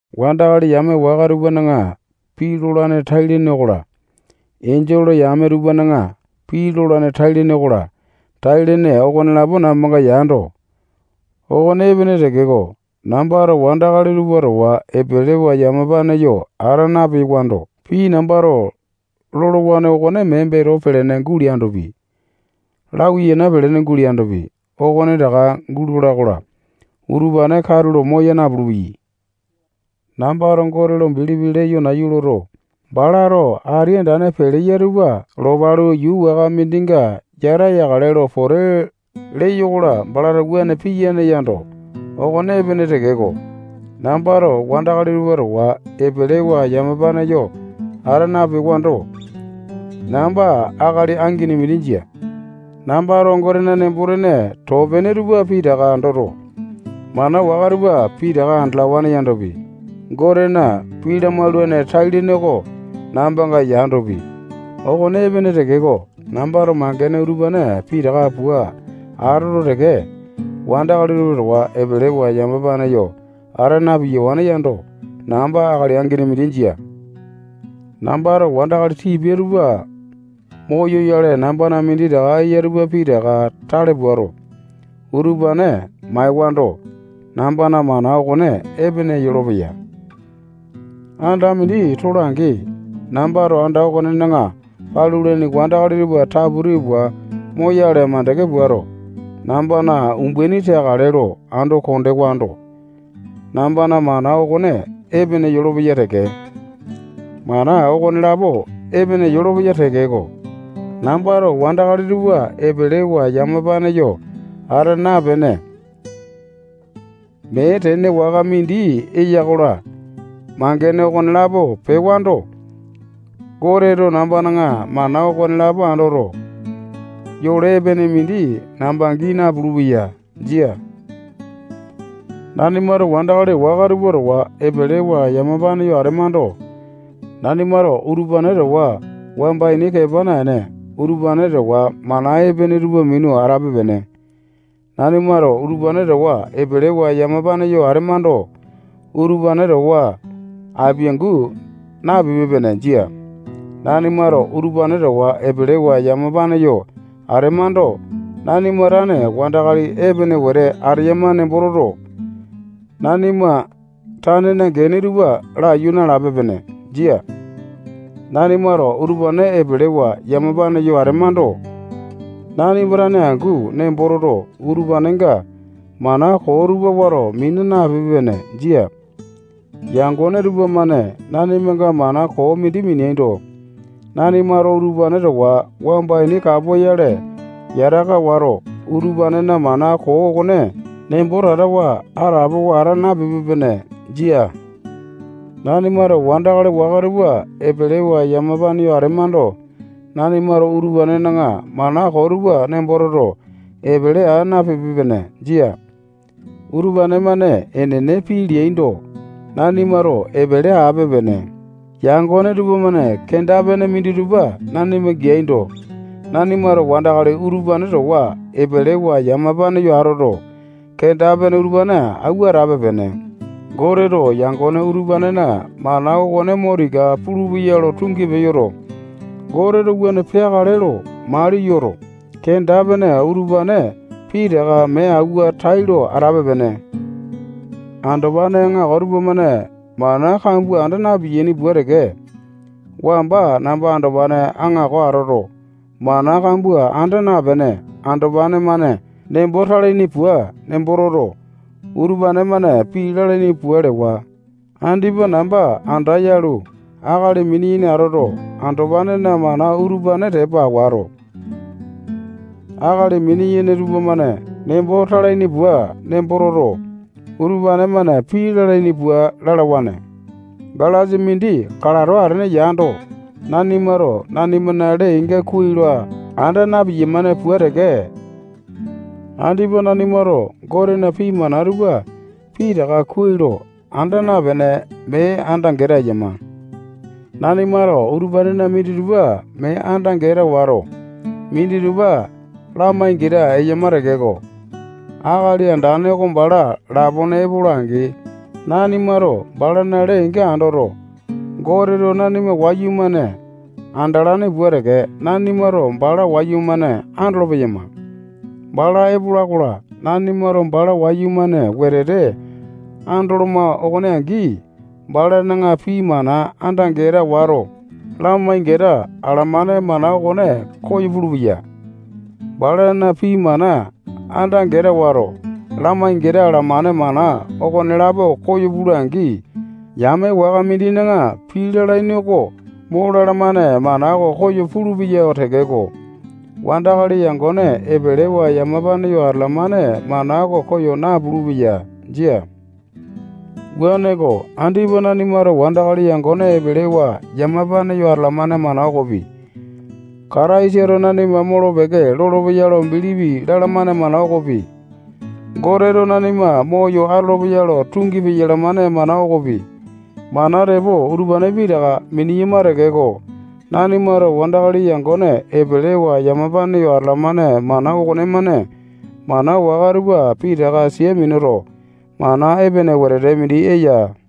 Wandakali yame waka tupana pii lolane tai-lene okola, enjole yame tupana pii lolane tai-lene okola, tai-lene okonelapo nambanga yando, okone epene tekeko, nambato wandakali tupa towa epelewa yamapane yo ata napewando, pii nambato lolowa okone mee beto pelene guleandopi, lawiyana pelene guleandopi, okonetaka gulola-kola, utupane katulo moya napulu-peyai. Nambato Gote lo bilipi leyo nayu loto, balato ati andane peleya tupa lopalu, yuu waka mindinga yata yakale lo pote leyo-kola, balato wuane piyae yando, okone epene tekeko, nambato wandakali tupa towa epelewa yamapane yo ata napewando, namba akali angini mindi jia. Nambato Gotena nembo-tene too pene tupa pitaka andoto, mana waka tupa pitaka andalawane yandopi, Gotena pii lamaulane tai-lene oko nambanga yandopi, okone epene tekeko, nambato mangene utupane pitaka pua atoto teke, wandakali tupa towa epelewa yamapane yo ata na-piyawane yando, namba akali angini mindi jia. Nambato wandakali tipia tupa moyoyale, nambana minditaka eya tupa pitaka tale puato, utupane maewando, nambana mana okone epene yolopeya. Anda mindi tola-angi, nambato anda okonena palulaini wandakali tupa taputi pua moyale makande puato, nambana umbaini teakale lo ando kondewando, nambana mana okone epene yolopeya teke. Mana okonelapo epene yolopeya tekeko, nambato wandakali tupa epelewa yamapane yo ata napene, mee tene waka mindi eya-kola, mangene okonelapo pewando, Goteto nambana mana okonelapo andoto, yole epene mindi namba gii napulu-peya. Jia. Nanimato wandakali waka tupa towa epelewa yamapane yo atemando, nanimato utupane towa wamba ini kepa naene, utupane towa mana epene tupa minu atape-pene. Nanimato utupane towa epelewa yamapane yo atemando, utupane towa apiangu napipe-pene. Jia. Nanimato utupane towa epelewa yamapane yo atemando, nanima tane wandakali epene wete ateyama nembo toto, nanima tanena gene tupa laiyu nalape-pene. Jia. Nanimato utupane epelewa yamapane yo atemando, nanima tane angu nembo toto, utupanenga mana koo tupa wato mina napipe-pene. Jia. Yangone tupamane nanimanga mana koo mindi mineaindo, nanimato utupane towa wamba ini kapoyale yataka wato, utupanena mana koo okone nembo tatawa atapowa ata napipe-pene. Jia. Nanimato wandakali waka tupa epelewa yamapane yo atemando, nanimato utupanena mana koo tupa nembo toto, epele aa napipe-pene. Jia. Utupane-mane enene pii leaindo, nanimato epele ape-pene. Yangone tupamane kenda-pene minditupa nanima geaindo, nanimato wandakali utupane towa epelewa yamapane yo atoto, kenda-pene utupane awua atape-pene. Goteto yangone utupanena mana okone mo tika pulupeya lo tungi peyoto, Goteto wuane peakale lo mali yoto, kenda-pene utupane pitaka mee awua, tailo atape-pene. Andopane aŋako tupamane mana kambua anda na-piyaini pua teke, wamba namba andopane aŋako atoto, mana kambua anda napene, andopane-mane nembo talaini pua nembo toto, utupane-mane pii lalaini pua lewa. Andipa namba anda yalu, akali mini-yene atoto, andopanena mana utupane tepa wato, akali mini-yene tupamane nembo talaini pua nembo toto, utupane-mane pii lalaini pua lalawane. Galasa mindi kalato atene yando, nanimato nanimana lee-inga kuai lo anda na-piyamane pua teke, andipa nanimato Gotena pii mana tupa pitaka kuai lo anda napene, mee anda-geta eyama. Nanimato utupanena minditupa mee anda-geta wato, minditupa lamai-geta eyama tekeko, Akali Andane oko bala lapone epola-angi, nanimato balana lee-inga andoto, Goteto nanima wayumane andalane pua teke, nanimato bala wayumane andolo-peyama. Bala epola-kola, nanimato bala wayumane wetete andoloma okone angi, balana pii mana anda-geta wato, lamai-geta alamane mana okone koyo pulupeya. Balana pii mana anda-geta wato, lamai-geta alamane mana okonelapo koyo pula-angi, yame waka mindina pii lalaini oko mo lalamane mana oko koyo pulupeya tekeko, wandakali yangone epelewa yamapane yo atalamane mana oko koyo napulu-peya. Jia. Wuaneko, andipa nanimato wandakali yangone epelewa yamapane yo atalamane mana okopi, Kataisato nanima molo-peke lolopeya lo bilipi lalamane mana okopi, Goteto nanima moyo atolopeya lo tungi peyalamane mana okopi, mana tepo utupane pitaka mineyama tekeko, nanimato wandakali yangone epelewa yamapane yo atalamane mana okonemane mana waka tupa pitaka sia minuto, mana epene wetete mindi eya.